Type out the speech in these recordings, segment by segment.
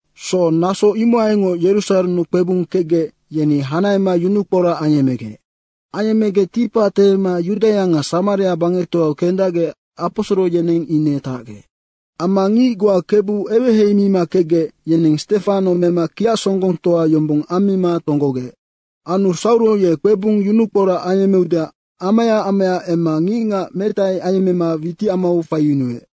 So, naso imohaingoc Yerusarennu kpebung kecgec, yeni hanahema yunukporac ayemmegec. Ayemmegec ticpac tehema Yudaia nga Samaria bangectoau kendacgec aposoro yeneng ine tacgec. Amma ngic goa Kebu eweheimima kecgec, yeneng Stefano mema kiacsonggongtoa yombong ammima tonggogec. Anu Sauro ye kpebung yunukporac ayemmeudeac amaya amaya emma ngicngac metai ayemmema witicamau faiyunuec.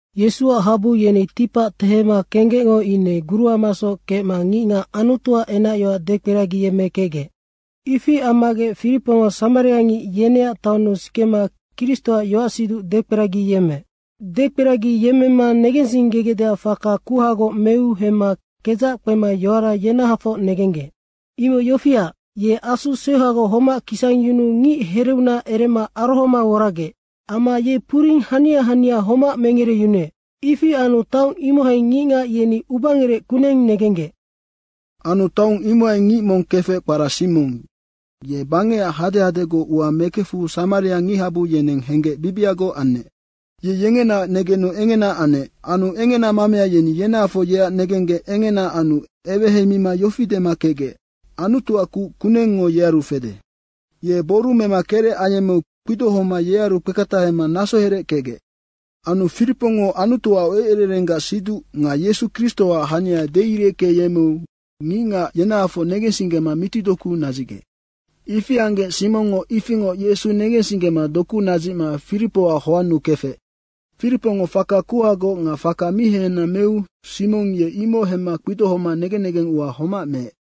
Yesuac habu yeni ticpac tehema kenggecngo ine guruamasoc kecma ngicngac Anutuac enacyoac dekperagiyemmekecgec. Ifi ammagec Firipongo samariangic yeneac taonnu sikema Kristoac yoacsiduc dekperagiyemmeec. Dekperagiyemmema negensinggegecdeac faka kuhagoc meu hemma kedzac kpema yoara yenahafoc negenggec. Imoc yofiac, ye asu seuhagoc homac kisangyunuu ngic hereunac erema arohoma woragec. Amma ye puring hania hania homac mengereyunuec. Ifi anu taong imohai ngicngac yeni ubangerec kuneng negenggec. Anu taong imohai ngic mong kefec kpara Simong, ye bangecac hadehadegoc ua mekefu samariangichabu yeneng henggec bibiagoc anec. Ye yengenaac negenu engena anec. Anu engena mamea yeni yenahafoc yeac negenggec engena anu eweheimima yofi dema kecgec, “Anutuac kuc kunengngo yearu fede.” Ye boru mema kerec ayemmeu kpidohoma yearu kpeketahema nasoherec kecgec. Anu Firipongo Anutuac eucererenggac siduc nga Yesu Kristoac hania deireckeyemmeu ngicngac yenahafoc negensinggema mitidoku nadzicgec. Ifi anggec Simongngo ifingoc Yesu negensinggema doku nadzicma Firipoac hoannu kefec. Firipongo faka kuhagoc nga faka mi hehena meu Simong ye imoc hemma kpidohoma negen negeng ua homac meec.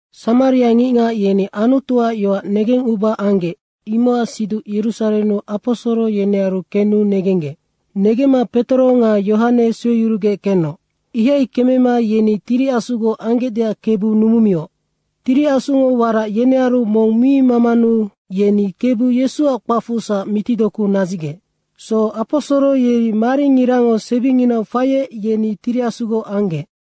Samariangicngac yeni Anutuac yoac negenguba anggec, imocac siduc Yerusarennu aposoro yenearu kenu negenggec. Negemma Petoro nga Yohane sueyurugec kenoc. Ihai kemema yeni Tiri Asugoc anggecdeac Kebu numumioc. Tiri Asungo warac yenearu mong mi mamanu yeni Kebu Yesuac kpacfusac mitidoku nadzicgec. So, aposoro yeri maringirango sebinginau faiec yeni Tiri Asugoc anggec.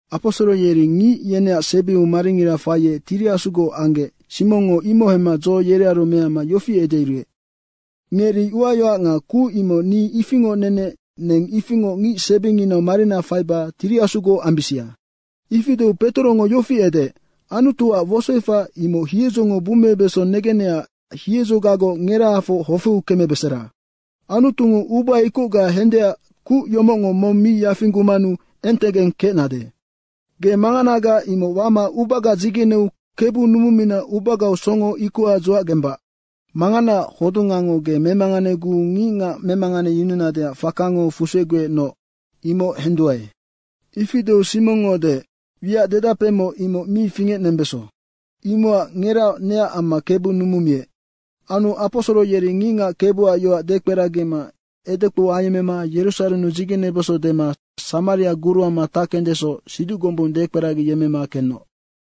Aposoro yeri ngic yeneac sebiu maringira faiec Tiri Asugoc anggec, Simongngo imoc hemma dzo yerearu mehama yofi edeyuruec, “Ngeri uayoac nga kuc imoc ni ifingoc nenec neng ifingoc ngicsebinginau marina faiba Tiri Asugoc ambisia.” Ifi deu Petorongo yofi edeec, “Anutuac wosoefac imoc hiedzongo bummebeso negennecac hiedzogagoc ngerahafoc hofeu kemebesera. Anutungo uba ikocga hendeac kuc yomocngo mong mi yafinggumanu entegeng kecnade. Ge manganaga imoc wama ubaga dzigeneu Kebu numumina ubagau songo ikoha dzuacgembac. Manganaac hodungango ge memanganeguu ngicngac memanganeyununadeac fakango fuseguecnoc.” imoc henduae. Ifi deu Simongngo deec, “Wiac dedapemoc, imoc mi fingecnembeso. Imocac ngeraoc neac amma Kebu numumiec.” Anu aposoro yeri ngicngac Kebuac yoac dekperagima edekpou ayemmema Yerusarennu dzigenebeso dema Samaria guruama tackendesoc siduc gombung dekperagiyemmema kenoc.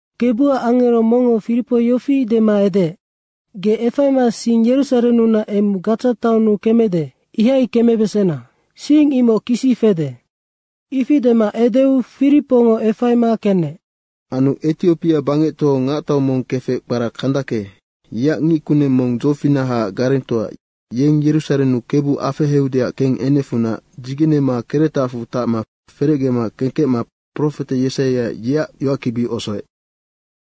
Kebuac angero mongngo Firipo yofi dema edeec, “Ge efaima sing Yerusarennunac emu Gadza taonnu kemede, imohai kembesena. Sing imoc kisi fede.” Ifi dema edeu Firipongo efaima kenec. Anu Etiopia bangectoau ngactau mong kefec kpara Kandake, yeac ngickuneng mong dzofinahaac garengtoa, yeng Yerusarennu Kebu afeheudeac kengenecfunac dzigenema keretacfu tacma ferecge kemma profete Yesaia, yeac yoackibi osoec.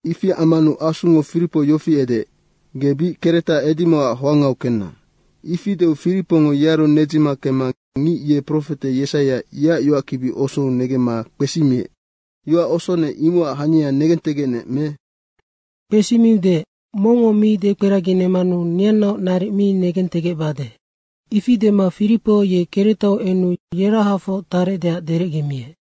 Ifi ammanu Asungo Firipo yofi edeec, “Ge bic keretac edimocac hoangau kenna.” Ifi deu Firipongo yearu nedzima kemma ngic ye profete Yesaia, yeac yoackibi osou negemma kpesimiec, “Yoac osonec, imocac hania negentegecnec me?” Kpesimiu deec, “Mongngo mi dekperaginemmanu neannaoc naric mi negentegecbade.” Ifi dema Firipo ye keretau enu yerahafoc tarecdeac derecgemiec.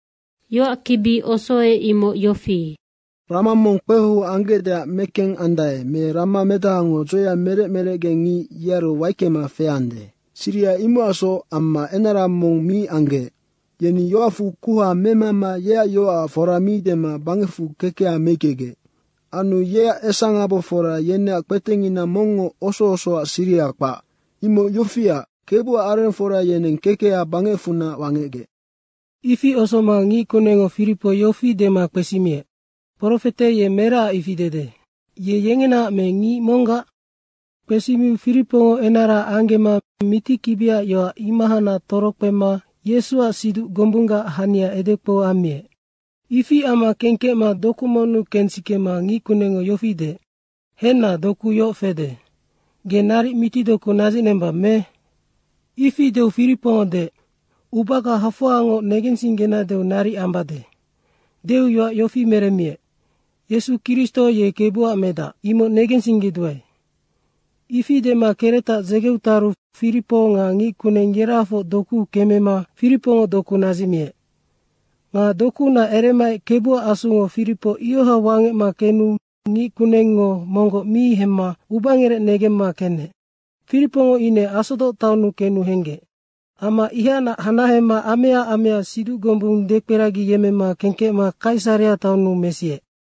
Yoackibi osoec, imoc yofi, “Rama mong kpehou anggecdeac mekengandae me ramamedahango dzoea merec merecgengic yearu waickema feande, siriha imocacsoc amma enara mong mi anggeec. Yeni yoacfu kuha memama yeac yoacac fora mi dema bangecfu kekeha meickegec. Anu yeac esangabofora yeneac kpetengina mongngo oso osoac siriha kpac. Imoc yofiac, Kebuac arengfora yeneng kekeha bangecfunac wangecgec.” Ifi osoma ngickunengngo Firipo yofi dema kpesimiec, “Profete ye meracac ifi dede, ye yengenaac me ngic monggac?” Kpesimiu Firipongo enara anggema mitikibiac yoac imohacnac torokpema Yesuac siduc gombunggac hania edekpou ammiec. Ifi amma kengkecma doku monnu kensikema ngickunengngo yofi deec, “Henna, doku yoc fede, ge naric mitidoku nadzicnembang me?” Ifi deu Firipongo deec, “Ubaga hafoangoc negensinggenadeu naric ambade.” deu yoac yofi meremmiec, “Yesu Kristo ye Kebuac medac, imoc negensinggeduae.” Ifi dema keretac dzegeu taru Firipo nga ngickuneng yerahafoc dokuu kemema Firipongo doku nadzicmiec. Nga dokuunac eremaec Kebuac Asungo Firipo ioha wangecma kenu ngickunengngo monggoc mi hemma ubangerec negemma kenec. Firipongo ine Asodoc taonnu kenu henggec. Amma ihacnac hanahema amea amea siduc gombung dekperagiyemmema kengkecma Kaisarea taonnu mesiec.